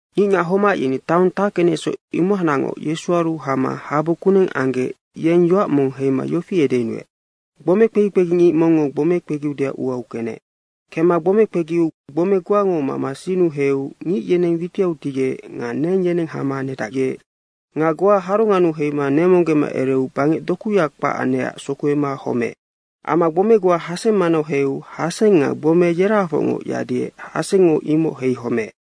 Ngicngac homac yeni taong tackenecsoc, imohacnacngoc Yesuaru hama habu kuneng anggec yeng yoac mong heima yofi edeyunuec, “Gbome kpegi kpegingic mongngo gbome kpegiudeac uau kenec. Kemma gbome kpegiu gbome goango mama sinnu heiu ngic yeneng witiau tigec nga neng yeneng hama nedacgec. Nga goa harongannu heima nemonggema ereu bangec dokuya kpac anecac sokuema homeec. Amma gbomea goa haseng manau heiu haseng nga gbomea yerahafocngoc yadiec hasengngo imoc heihomeec.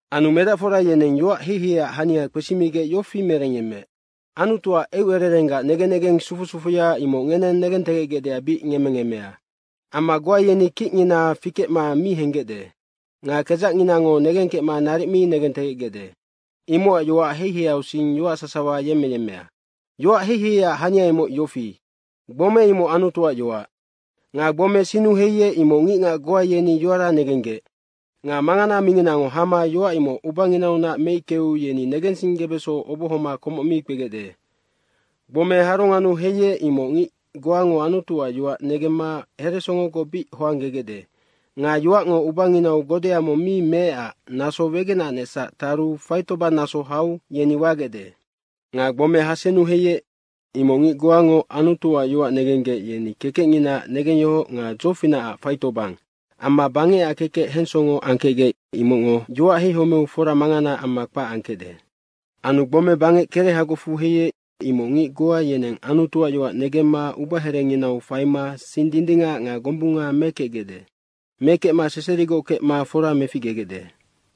Anu medacfora yeneng yoac heiheiac hania, imocac kpesimigec yofi merengyemmeec, “Anutuac eucererenggac negen negeng sufu sufuya, imoc ngeneng negentegecgecdeac bic ngemmengemmea. Amma goa yeni kicngina fikecma mi henggecde nga kedzacnginango negengkecma naric mi negentegecgecde, imocac yoac heiheiausing yoac sasawa yemmeyemmea.” “Yoac heiheiac hania imoc yofi, gbome imoc Anutuac yoac. Nga gbome sinnu heiec, imoc ngicngac goa yeni yoara negenggec. Nga mangana minginango hama yoac imoc ubanginaunac meickeu yeni negensinggebeso obohoma komoc mi kpegecde. Gbome harongannu heiec, imoc ngic goango Anutuac yoac negemma heresongogoc bic hoanggegecde nga yoacngo ubanginau godea mong mi meecac naso wegenanecsac taru faitobannaso hau yeni wagecde. Nga gbome hasennu heiec, imoc ngic goango Anutuac yoac negenggec, yeni kekecnginaac negengyohoc nga dzofinacac faitobang amma bangecac kekec hensongo angkecgec, imocngo yoac heihomeu fora mangana amma kpac angkecde.” “Anu gbome bangec kerehagocfu heiec, imoc ngic goa yeneng Anutuac yoac negemma ubaherenginau faima sing dindingac nga gombunga mekecgecde. Mekecma seserigoc kecma fora meficgegecde.”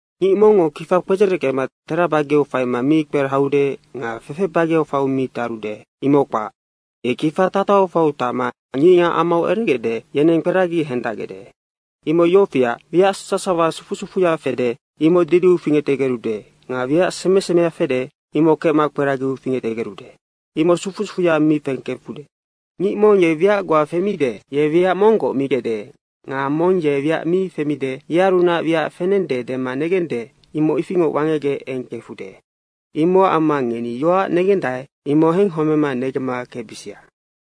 “Ngic mongngo kifa kpedzereckema tera bageau faima mi kperahaude nga fefe bageau faiu mi tarude. Imoc kpac, ye kifa tatahau faiu tacma ngicngac amau eregecde, yeneng kperagi hendacgecde. Imoc yofiac, wiac sasawa sufu sufuya fede, imoc didiu fingectegerude nga wiac seme semea fede, imoc kecma kperagiau fingectegerude. Imoc sufu sufu mi kengkefude. Ngic mong ye wiac goa femide, ye wiac monggoc migecde nga mong ye wiac mong mi femide, yearunac wiac fenende dema negende, imoc ifingoc wangecgec eng kefude. Imocac amma ngeni yoac negendae, imoc henghomema negemma kecbisia.”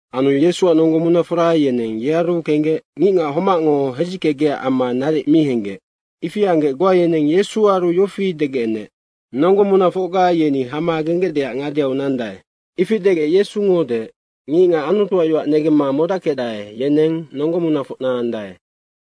Anu Yesuac nonggo munafora yeneng yearu kenggec ngicngac homacngo hedzickegecac amma naric mi henggec. Ifi anggec goa yeneng Yesuaru yofi degec enec, “Nonggo munafocga yeni hama genggecdeac ngadeau nandae.” Ifi degec Yesungo deec, “ngicngac Anutuac yoac negemma modackecdae, yeneng nonggo munafocna andae.”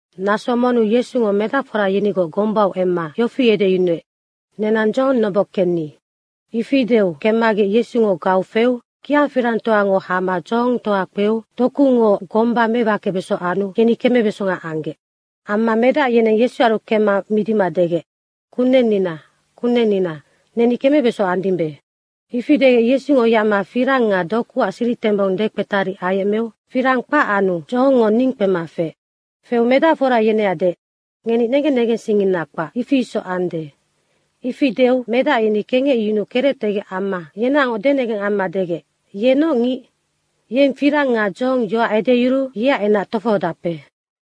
Naso monnu Yesungo medacfora yenigoc gombau emma yofi edeyunuec, “Nenang dzohong noboc kenni.” Ifi deu kemmagec Yesungo gau feu kia firangtoango hama dzohongtoa kpeu dokungo gomba mewakebeso anu yeni kemebeso anggec. Amma medac yeneng Yesuaru kemma midima degec, “Kunennina, Kunennina, neni kemebesonga andimbe.” Ifi degec Yesungo yacma firang nga dokuac siritembong dekpetari ayecmeu firang kpac anu dzohongngo ning kpema feec. Feu medacfora yeneac deec, “Ngeni negen negensingngina kpac, ifi isoc ande.” Ifi deu medac yeni kengecyunuu kerectegec amma yenaocngoc denegeng amma degec, “Ye noc ngic? Yeng firang nga dzohong yoac edeyuruu yeac enac tofohodape.”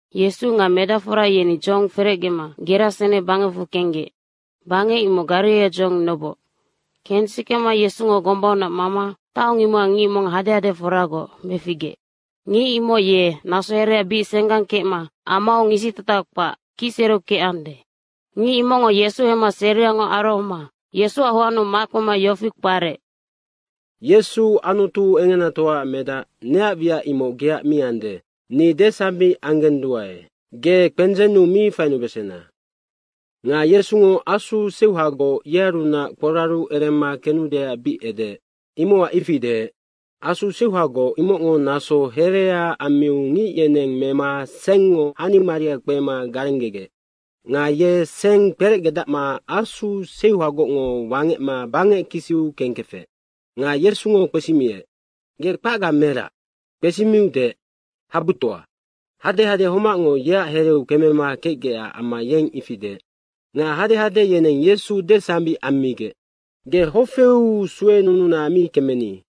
Yesu nga medacfora yeni dzohong ferecgema Gerasene bangecfu kenggec. Bangec imoc Gariraia dzohong noboc. Kensikema Yesungo gombaunac mama taong imocac ngic mong hadehadeforagoc meficgeec. Ngic imoc ye naso herea bic senggang kecma amau ngisitataha kpac kicsereu kecande. Ngic imocngo Yesu hemma seriangoc arohoma Yesuac hoannu makpema yofi kparec, “Yesu Anutu engenatoaac Medac, neac wiac imoc geac mi ande. Ni desambic anggenduae, ge kpendzennu mi fainubesena.” Nga Yesungo asu seuhagoc yearunac kporaru erema kenudeac bic edeec, imocac ifi deec. Asu seuhagoc imocngo naso herea ammiu ngic yeneng mema sengngo hanimaria kpema garenggegec. Nga ye seng kperecgedacma asu seuhagocngo wangecma bangec kisiu kengkefec. Nga Yesungo kpesimiec, “Ge kpacga merac?” Kpesimiu deec, “Habutoa.” Hadehade homacngo yeac hereu kemema kecgecac amma yeng ifi deec. Nga hadehade yeneng Yesu desambic ammigec, “Ge hofeu suenununa mi kemeni.”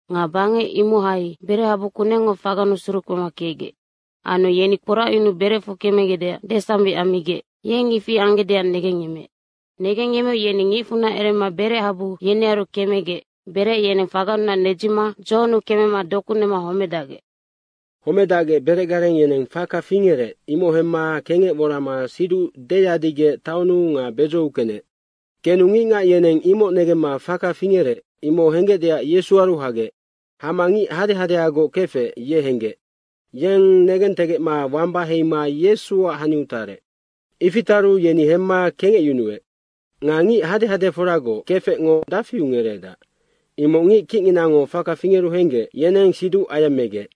Nga bangec imohai berechabu kunengngo fagannu surukpema kecgec. Anu yeni kporacyunuu berecfu kemegecdeac desambic ammigec yeng ifi anggecdeac negengyemmeec. Negengyemmeu yeni ngicfunac erema berec habu yenearu kemegec berec yeneng fagannunac nedzima dzohonnu kemema doku nema homedacgec. Homedacgec berecgareng yeneng faka fingerec, imoc hemma kengec worama siduc deyadigec taonnu nga bedzou kenec. Kenu ngicngac yeneng imoc negemma faka fingerec, imoc henggecdeac Yesuaru hagec. Hama ngic hadehadeagoc kefec, ye henggec. Yeng negentegecma wamba heima Yesuac haniu tarec. Ifi taru yeni hemma kengecyunuec. Nga ngic hadehadeforagoc kefecngo dafiu ngereedac, imoc ngic kicnginango faka fingeru henggec, yeneng siduc ayemmegec.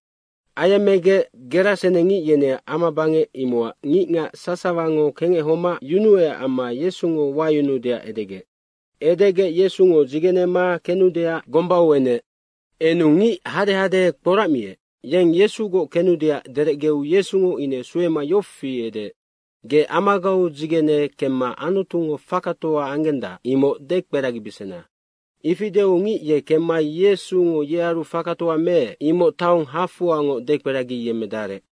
Ayemmegec gerasenengic yeneac amabangec, imocac ngicngac sasawango kengec homac yunuecac amma Yesungo wayunuudeac edegec. Edegec Yesungo dzigenema kenudeac gombau enec. Enu ngic hadehade kporacmiec, yeng Yesugoc kenudeac derecgeu Yesungo ine suema yofi edeec, “Ge amagau dzigene kemma Anutungo fakatoa anggendac, imoc dekperagibesena.” Ifi deu ngic ye kemma Yesungo yearu fakatoa meec, imoc taong hafoangoc dekperagiyemmedarec.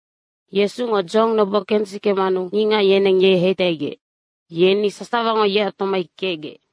Yesungo dzohong noboc kensikemanu ngicngac yeneng ye heitaigec. Yeni sasawango yeac tomai kecgec.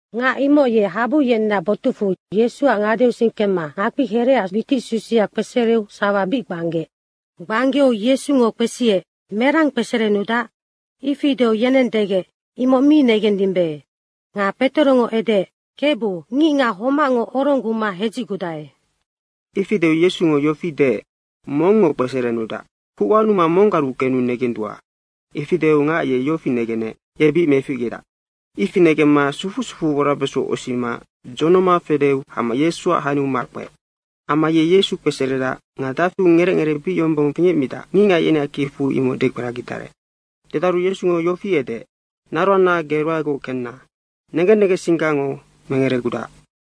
Ngac imoc ye habu yeneac botucfu Yesuac ngadeausing kemma ngakpiherehaac witic susia kpesereu sawa bic gbanggeec. Gbanggeu Yesungo kpesiec, “Merang kpeserenudac?” Ifi deu yeneng degec, “Imoc mi negendimbe.” nga Petorongo edeec, “Kebu, ngicngac homacngo orongguma hedzicgudae.” Ifi deu Yesungo yofi deec, “Mongngo kpeserenudac, kuc wanuma monggaru kenu negendua.” Ifi deu ngac ye yofi negenec, “Ye bic meficgedac.” Ifi negemma sufu sufu worabeso osima dzonoma fedeu hama Yesuac haniau makpeec. Amma ye Yesu kpeseredac nga dafiu ngerec ngeree bic yombong fingecmidac, ngicngac yeneac kicfu imoc dekperagidarec. Dedaru Yesungo yofi edeec, “Naroanna, ge ruaegoc kenna. Negen negensinggango mengeregudac.”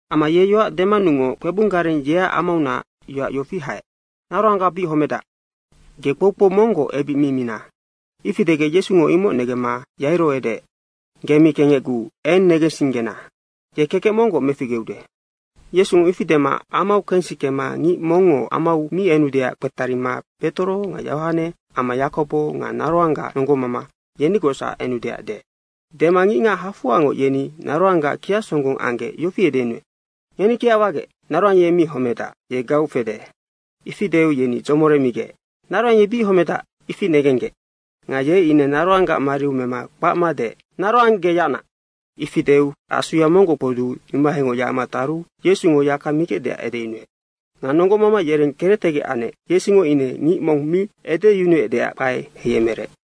Amma ye yoac denammanungoc kpebung gareng, yeac amaunac yoac yofi haec, “Naroangga bic homedac, ge kpoukpou monggoc ebic mi mina.” Ifi degec Yesungo imoc negemma Yairo edeec, “Ge mi kengecguu eng negensinggena. Ye kekec monggoc meficgeude.” Yesungo ifi dema amau kensikema ngic mongngo amau mi enudeac kpetarima Petoro nga Yohane amma Yakobo nga naroanggac nonggomama, yenigocsac enudeac deec. Dema ngicngac hafoangoc yeni naroanggac kiacsonggong anggec yofi edeyunuec, “Ngeni kiac wagec, naroang ye mi homedac, ye gau fede.” ifi deu yeni dzomoremigec. Naroang ye bic homedac, ifi negenggec. Nga ye ine naroanggac mariau mema kpacma deec, “Naroang, ge yacna.” Ifi deu asuya monggoc kpoduu imohaingoc yacma taru Yesungo yaka migecdeac edeyunuec. Nga nonggomama yereng kerectegec anec Yesungo ine ngic mong mi edeyunuecdeac kpae heiyemerec.